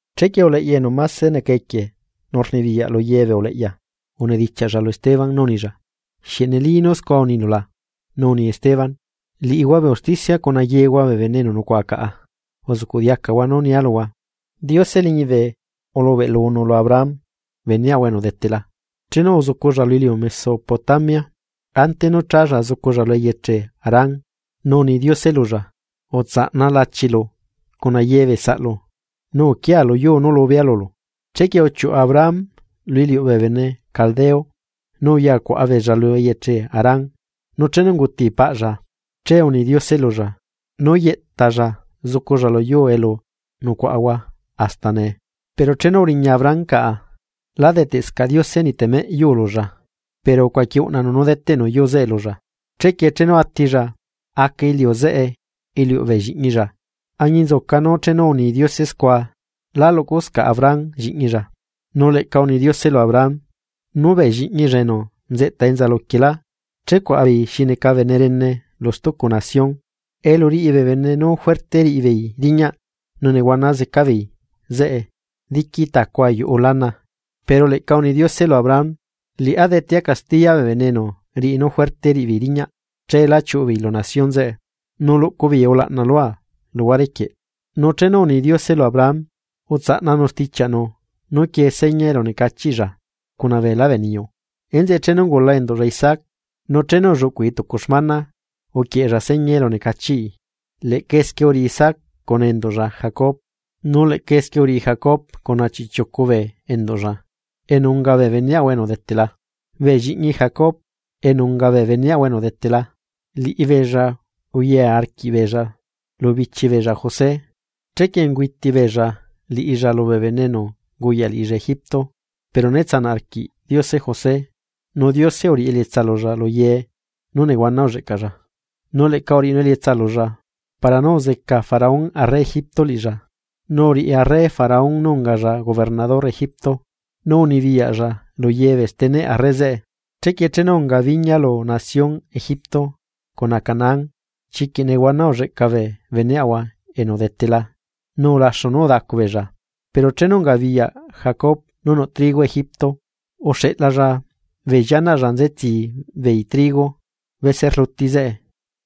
Chequie uleꞌya enu máse neca equie nu rnibiyaꞌ lu ye bee uleꞌya unidichiaꞌlla lu Esteban nú unilla: ―¿Xieꞌ neli nú scua unilu la? Nu uni Esteban: ―Liꞌihua bee usticia cuna yehua bee bene enu nucuaꞌa caꞌa, uzuꞌcuꞌ diacahua nú nia luhua. Diose liñibe ulubeꞌlunu lu Abraham beneꞌahua enu udetela, chenu uzuculla lu iliu Mesopotamia, ante nú chálla zuculla lu eyeche Harán. Nu uni Diose lulla: “Utsaꞌna lachilu cuna ye bee saꞌlu, nu uquia luyuu nú lubea lulu.” Chequie uchiuꞌu Abraham lu iliuꞌ bee bene Caldea, nu uyacuaꞌa beella lu eyeche Harán. Nu chenu unguti paꞌlla, che uni Diose lulla nú yeꞌtalla zuculla luyuu elu nucuaꞌahua hasta nee. Pero chenu uriña Abraham caꞌa, lá deteꞌscaꞌ Diose niꞌ temeꞌ yuu lulla, pero ucuaqui uꞌnanu nú deteꞌnu yuu zeꞌe lulla. Chequie chenu atilla, aca iliu zeꞌe iliuꞌ bee lliꞌñilla, añinzuca nú chenu uni Diose scua lá luꞌcuscaꞌ Abraham lliꞌñilla. Nu leꞌca uni Diose lu Abraham, nú bee lliꞌñilla enu nzeꞌta enza luquielá checuaꞌa beei xi neca bene rene lu stucu nación, elu riꞌi bee bene nú juerte riꞌibeei riñaꞌ nu nehuana zeca beei zeꞌe diqui tacu ayuꞌu lana. Pero leꞌca uni Diose lu Abraham: “Liꞌá detea castiya bee bene enu riꞌi nú juerte riꞌibeei riñaꞌ. Cheelá chiuꞌu beei lu nación zeꞌe, nu luꞌcu beei ulaꞌna lua luhuare quieꞌ.” Nu chenu uni Diose lu Abraham, utsaꞌnanu stichiaꞌnu nú quiee seña elunecachiꞌlla cuna beelá bee niyu. Enzeꞌe chenu ungula enduꞌlla Isaac, nu chenu ulluꞌcui tucu xmana uquieꞌella seña elunecachiꞌi. Leꞌca esquie uriꞌi Isaac cuna enduꞌlla Jacob. Nu leꞌca esquie uriꞌi Jacob cuna chiꞌchiucu bee enduꞌlla enu unga bee beneꞌahua enu udetela. ’Bee lliꞌñi Jacob, enu unga bee beneꞌahua enu udetela, liꞌibeella uya arquiꞌbeella lu bichi beella José. Chequie ungüiti beella liꞌilla lubee bene enu unguyaꞌ liꞌilla Egipto. Pero né tsanaꞌ arquiꞌ Diose José, nu Diose uriꞌi elietsa lulla lu ye nú nehuana ulleꞌcalla, nu leꞌca uriꞌinu elietsa lulla para nú uzeca Faraón arre Egipto liꞌilla, nu uriꞌi arre Faraón nú ungalla gobernador Egipto, nu unibiyaꞌlla lu ye bee steneꞌ arre zeꞌe. ’Chequie chenu unga biña lu nación Egipto cuna Canaán, chiquiꞌ nehuana ulleꞌca bee beneꞌahua enu udetela nu ulaxu nú udacu beella. Pero chenu ungabiyaꞌ Jacob beneꞌahua enu udetela nú nuꞌ trigo Egipto, uxeꞌlalla bee llianaꞌlla nzetsi beei trigo bese rlu zeꞌe.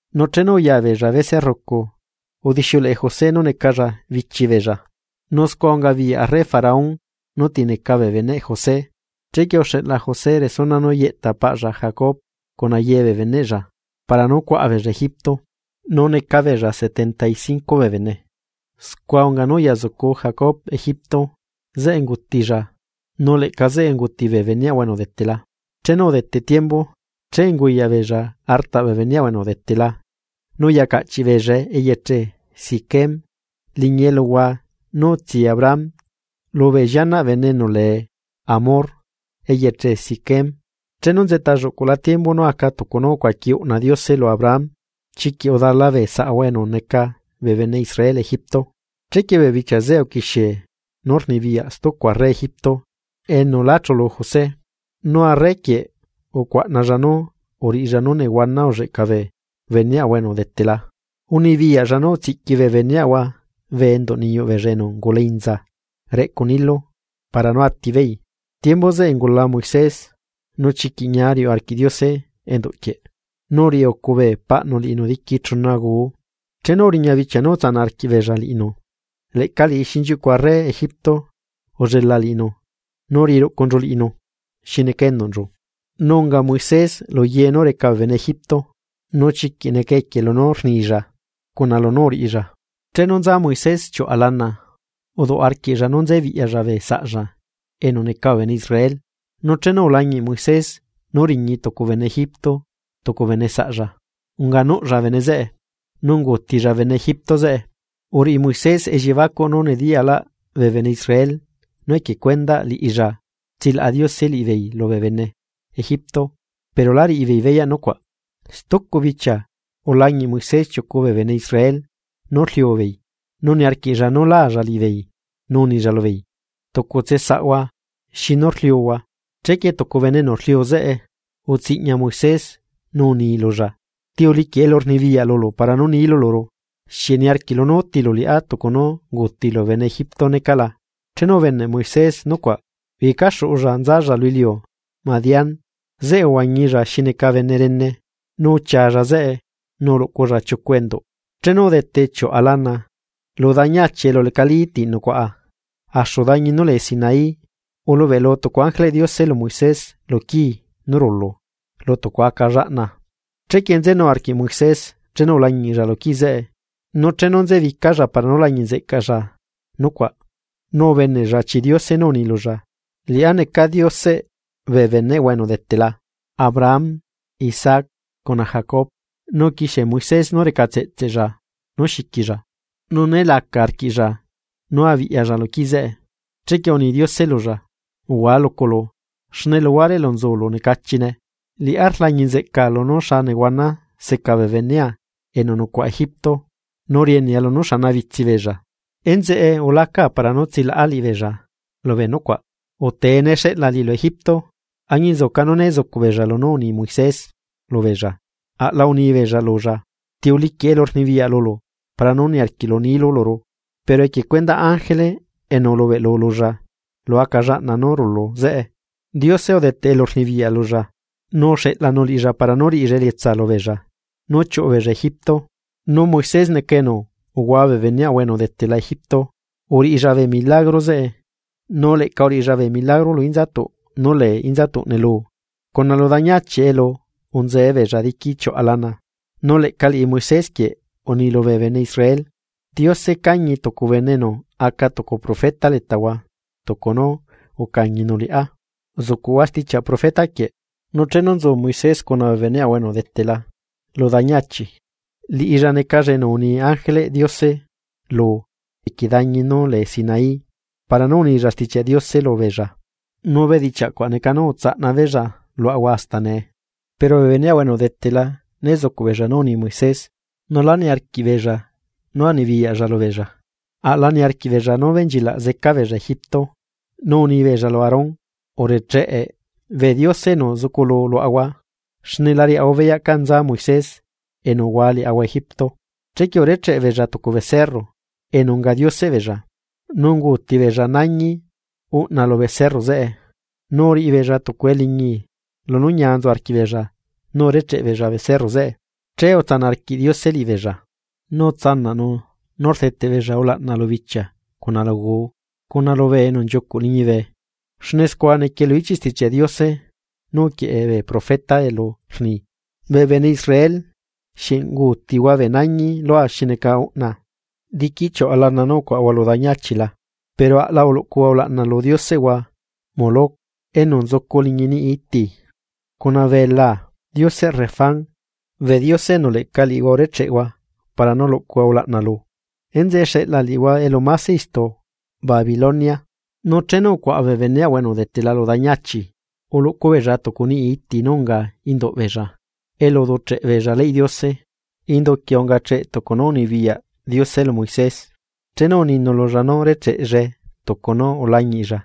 Nu chenu uya beella bese rrucu, udixiuleꞌe José nú necalla bichi beella, nu scua ungabiyaꞌ arre Faraón nú ti neca bee beneꞌ José. Chequie uxeꞌla José resuna nú yeꞌta paꞌlla Jacob cuna ye bee beneꞌlla para nú cuaꞌa beella Egipto, nu neca beella setenta y cinco bee bene. Scua unga nú uya zucu Jacob Egipto. Zeꞌe ungutilla, nu leꞌca zeꞌe unguti bee beneꞌahua enu udetela. Chenu udete tiembu, che unguyaꞌbeella artaꞌ bee beneꞌahua enu udetela, nu uya caꞌchiꞌ beellae eyeche Siquem, liñi eluhua nú utsi Abraham lubee llianaꞌ bene enu lee Hamor eyeche Siquem. ’Chenu nzeꞌta lluꞌcula tiembu nú aca tucu nú ucuaqui uꞌna Diose lu Abraham, chiquiꞌ udala bee saꞌahua enu neca bee bene Israel Egipto. Chequie bee bichia zeꞌe uquixie nú rnibiyaꞌ stucu arre Egipto enu lá chulu José. Nu arre quieꞌ ucuaꞌnalla nú uriꞌilla nú nehuana ulleꞌca bee beneꞌahua enu udetela. Unibiyaꞌlla nú utsiꞌqui bee beneꞌahua bee enduꞌ niyuꞌ beella enu ungula inza reꞌcu Nilo para nú atibeei. Tiembu zeꞌe ungula Moisés. Nu chiquiꞌ ñia riuꞌ arquiꞌ Diose enduꞌ quieꞌ, nu uriꞌiucu bee paꞌnu liꞌinu diqui chuna guu. Chenu uriña bichia nú utsanaꞌ arquiꞌbeella liꞌinu, leꞌca liꞌi xinchiuꞌcu arre Egipto ullelaꞌ liꞌinu nu uriꞌi ruꞌcunchu liꞌinu xi neca enduꞌnchu. Nu unga Moisés ye nú reca bee bene Egipto, nu chiquiꞌ neca equie lunú rnilla cuna lunú uriꞌilla. ’Chenu nza Moisés chiuꞌa lana, uduꞌ arquiꞌlla nú nzebiꞌyalla bee saꞌlla enu neca bee bene Israel. Nu chenu ulañiꞌ Moisés nú riñi tucu bene Egipto tucu bene saꞌlla. Unganuꞌlla bene zeꞌe, nu unguutilla bene Egipto zeꞌe. Uriꞌi Moisés elliebacuꞌ nú nediyalaꞌ bee bene Israel nú equie cuendaꞌ liꞌilla tsilaꞌa Diose liꞌibeei lubee bene Egipto, pero la riꞌibeei beyaꞌ nucuaꞌ. Stucu bichia, ulañiꞌ Moisés chiucu bee bene Israel nú rliu beei, nu niarquiꞌlla nú laalla liꞌibeei, nu unilla lubeei: “Tucutse saꞌhua, ¿xinu rliuhua?” Chequie tucu bene enu rliu zeꞌe, utsiꞌñai Moisés nu uni lulla: “¿Ti uliquiꞌ elurnibiyaꞌ lulu para nú nilu luru? ¿Xieꞌ niarquiꞌlu nú útilu liꞌá tucu nú unguutilu bene Egipto necaꞌ la?” Chenu ubeneꞌ Moisés nucuaꞌ, uyecaxuꞌulla nzalla lu iliu Madián. Zeꞌe uzuculla xi neca bene rene, nu uchialla zeꞌe nu uluꞌculla chiucu enduꞌ. ’Chenu udete chiuꞌa lana, lu dañi achi elu lecalí ti nucuaꞌa, axu dañi nú lee Sinaí, ulubeꞌlu tucu ángeleꞌ Diose lu Moisés lu quii nú rulu lu tucu aca llaꞌna. Chequie nzenu arquiꞌ Moisés chenu ulañiꞌlla quii zeꞌe, nu chenu nzebicalla para nú lañiꞌ nzeꞌcalla nucuaꞌ, nu ubeneꞌlla chi Diose nú uni lulla: “Liꞌá neca Dioseꞌ bee beneꞌhua enu udetela Abraham, Isaac, cuna Jacob.” Nu uquixie Moisés nú recatseꞌtseꞌlla nú xiquilla, nu né laca arquiꞌlla nú abiꞌyalla lu quii zeꞌe. Chequie uni Diose lulla: “Uhua luculu, xne luhuare elu nzulu necachine. Liꞌá rlañi nzeꞌca lunú xa nehuana seca bee benea enu nucuaꞌa Egipto, nu rienea lunú xanabitsi beella, enzeꞌe ulaca para nú tsilaꞌa liꞌibeella lubee nucuaꞌ. Utee, ne xeꞌla liꞌilu Egipto.” ’Añinzuca nú né zucuꞌbeella lunú uni Moisés lubeella, aꞌla unibeella lulla: “¿Ti uliquiꞌ elurnibiyaꞌ lulu para nú niarquiꞌlu nilu luru?”, pero equie cuendaꞌ ángele enu ulubeꞌlu lulla lu aca llaꞌna nú rulu zeꞌe, Diose udeteꞌ elurnibiyaꞌ lulla, nu uxeꞌlanu liꞌilla para nú riꞌilla elietsa lubeella nú chiuꞌu beella Egipto. Nu Moisés neca enu uhua bee beneꞌahua enu udetela Egipto, uriꞌilla bee milagro zeꞌe, nu leꞌca uriꞌilla bee milagro lu inzatuꞌ nú lee inzatuꞌ neluu, cuna lu dañi achi elu unzee beella diqui chiuꞌa lana. Nu leꞌca liꞌi Moisés quieꞌ uni lubee bene Israel: “Diose cañi tucu bene enu aca tucu profeta letahua, tucu nú ucañinu liꞌá. Zuꞌcuhua stichiaꞌ profeta quieꞌ.” Nu chenu nzu Moisés cuna bee beneꞌahua enu udetela lu dañi achi, liꞌilla necalla enu uni ángeleꞌ Diose lu equie dañi nú lee Sinaí para nú unilla Stichiaꞌ Diose lubeella. Nu bedichiaꞌ cuaꞌ neca nú utsaꞌna beella luaꞌahua hasta nee. ’Pero bee beneꞌahua enu udetela né zucuꞌbeella nú uni Moisés, nu lá niarquiꞌbeella nú anibiyaꞌlla lubeella, aꞌla niarquiꞌbeella nú benchilaꞌ zeca beella Egipto. Nu unibeella lu Aarón: “Urecheꞌe bee diose enu zuculu luaꞌahua; xne la riaꞌahua beyaꞌ canza Moisés enu uhua liaꞌahua Egipto.” Chequie urecheꞌ beella tucu becerro enu unga dioseꞌ beella, nu unguuti beella nañi uꞌna lu becerro zeꞌe, nu uriꞌi beella tucu eliñi lunú ñia nzu arquiꞌbeella nú urecheꞌ beella becerro zeꞌe. Che utsanaꞌ arquiꞌ Diose liꞌibeella, nu utsanaꞌnu nú rdeteꞌ beella ulaꞌna lu bichia cuna lu guu cuna lubee enu nchiucuꞌ liñibe. Xne scua niquie lu ichiꞌ Stichiaꞌ Diose nú uquieꞌe bee profeta elu rni: Bee bene Israel, ¿xieꞌ unguutihua bee nañi lua xi neca uꞌna, diqui chiuꞌa lana nú ucuaꞌahua lu dañi achi la? Pero aꞌla uluꞌcuhua ulaꞌna lu dioseꞌhua enu lee Moloc enu nzucu liñi carpa nú necacheꞌ iti, cuna belaa dioseꞌ Renfán, bee diose enu leꞌca liꞌihua urecheꞌhua para nú luꞌcuhua ulaꞌna lu. Enzeꞌe xeꞌla liꞌihua elu máse istu Babilonia. ’Nu chenu ucuaꞌa bee beneꞌahua enu udetela lu dañi achi, uluꞌcu beella tucu niꞌi iti nú unga induꞌbeella elu uducheꞌ beella leyꞌ Diose. Indu quieꞌ ungacheꞌ tucu nú unibiyaꞌ Diose lu Moisés, chenu uninu lulla nú recheꞌllae tucu nú ulañiꞌlla.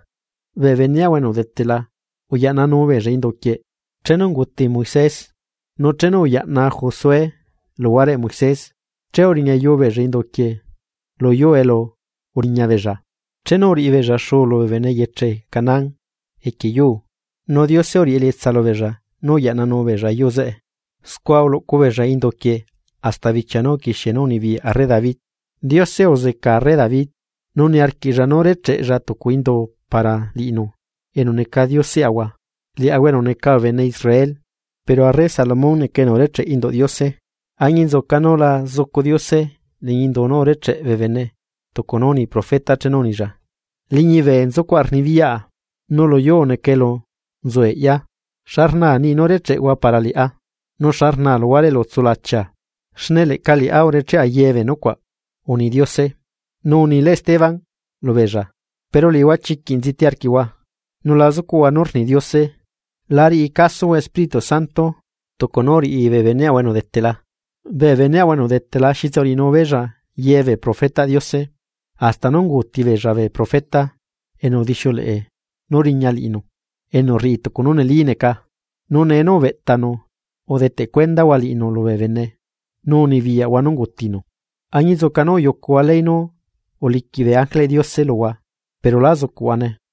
Bee beneꞌahua enu udetela uyaꞌnanu beella induquieꞌ chenu unguti Moisés, nu chenu uyaꞌna Josué luhuareꞌ Moisés che uriñayu beella indu quieꞌ luyuu elu uriñabeella, chenu uriꞌibeella xuu lubee bene eyeche Canaán equie yuu, nu Diose uriꞌi elietsa lubeella nú uyaꞌnanu beella yuu zeꞌe. Scua uluꞌcu beella indu quieꞌ hasta bichia nú uquixie nú unibiyaꞌ arre David. Diose uzeca arre David, nu niarquiꞌlla nú recheꞌlla tucu indu para liꞌinu enu neca dioseꞌahua, liaꞌahua enu neca bee bene Israel. Pero arre Salomón neca enu urecheꞌ induꞌ Diose. Añinzuca nú la zucu Diose liñi indu nú urecheꞌ bee bene tucu nú uni profeta chenu unilla: Liñibe nzucuaꞌa rnibiyaꞌa, nu luyuu neca elu nzu eꞌya. ¿Xa rnaa niꞌi nú recheꞌhua para liꞌá? ¿Nu xa rnaa luhuare elu tsulachia? Xne leꞌca liꞌá urecheꞌa ye bee nucuaꞌ, ―uni Diose. ’Pero liꞌihua ―unilá Esteban lu beella― chiquiꞌ nziti arquiꞌhua, nu la zucuꞌhua nú rni Diose. La riꞌi casohua Espirítu Santo. Tucu nú uriꞌi bee beneꞌhua enu udetela. Bee beneꞌhua enu udetela xitse uriꞌinu beella ye bee profetaꞌ Diose, hasta nú unguuti beella bee profeta enu udixiuleꞌe nú riña liꞌinu enu rriꞌi tucu nú neli neca, nu nee nú ubeꞌtanu, udeteꞌ cuendahua liꞌinu lubee bene, nu unibiyaꞌhua nú ungutinu. Añinzuca nú uyucuhua ley nú uliquiꞌ bee ángeleꞌ Diose luhua, pero lá zucuꞌhuane.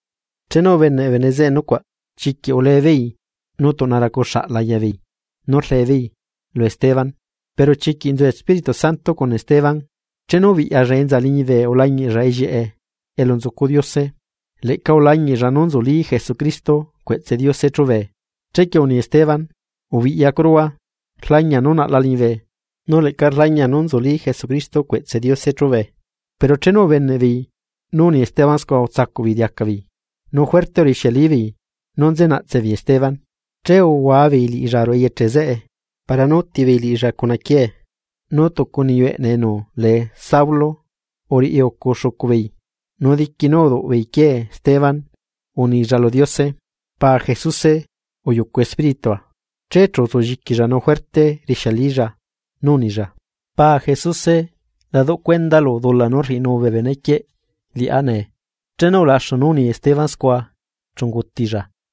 Chenu ubeneꞌ bee bene zeꞌe nucuaꞌ, chiquiꞌ ulebeei nu tuꞌna racu xaꞌ laya beei nú rlee beei lu Esteban. Pero chiquiꞌ nzu Espirítu Santo cuna Esteban, chenu ubiꞌyalla enza liñibe ulañiꞌlla ellieꞌe elu nzucu Diose, leꞌca ulañiꞌlla nú nzulí Jesucristo cueꞌtse Diose chubee. Chequie uni Esteban: ―¡Ubiꞌyacuruhua! Rlañia nú naꞌla liñibe, nu leꞌca rlañia nú nzulí Jesucristo cueꞌtse Diose chúbee. Pero chenu ubeneꞌbeei nú uni Esteban scua utsacuꞌ beei diaca beei, nu juerte urixialibeei nú nze naꞌtse beei Esteban. Che uhuabeei liꞌilla ruꞌu eyeche zeꞌe para nú útibeei liꞌilla cuna quiee, nu tucu niyu eꞌne enu lee Saulu uriꞌi ucu xucu beei. Nu diqui nú rduꞌbeei quiee Esteban, unilla lu Diose: ―Paa Jesuse uyucu espíritua. Che chu utsulliquilla nu juerte rixialilla nú unilla: ―Paa Jesuse, la duꞌ cuendalu dula nú rriꞌinu bee benequieꞌ liꞌá nee. Chenu ulaxu nú uni Esteban scua, chu ungutilla.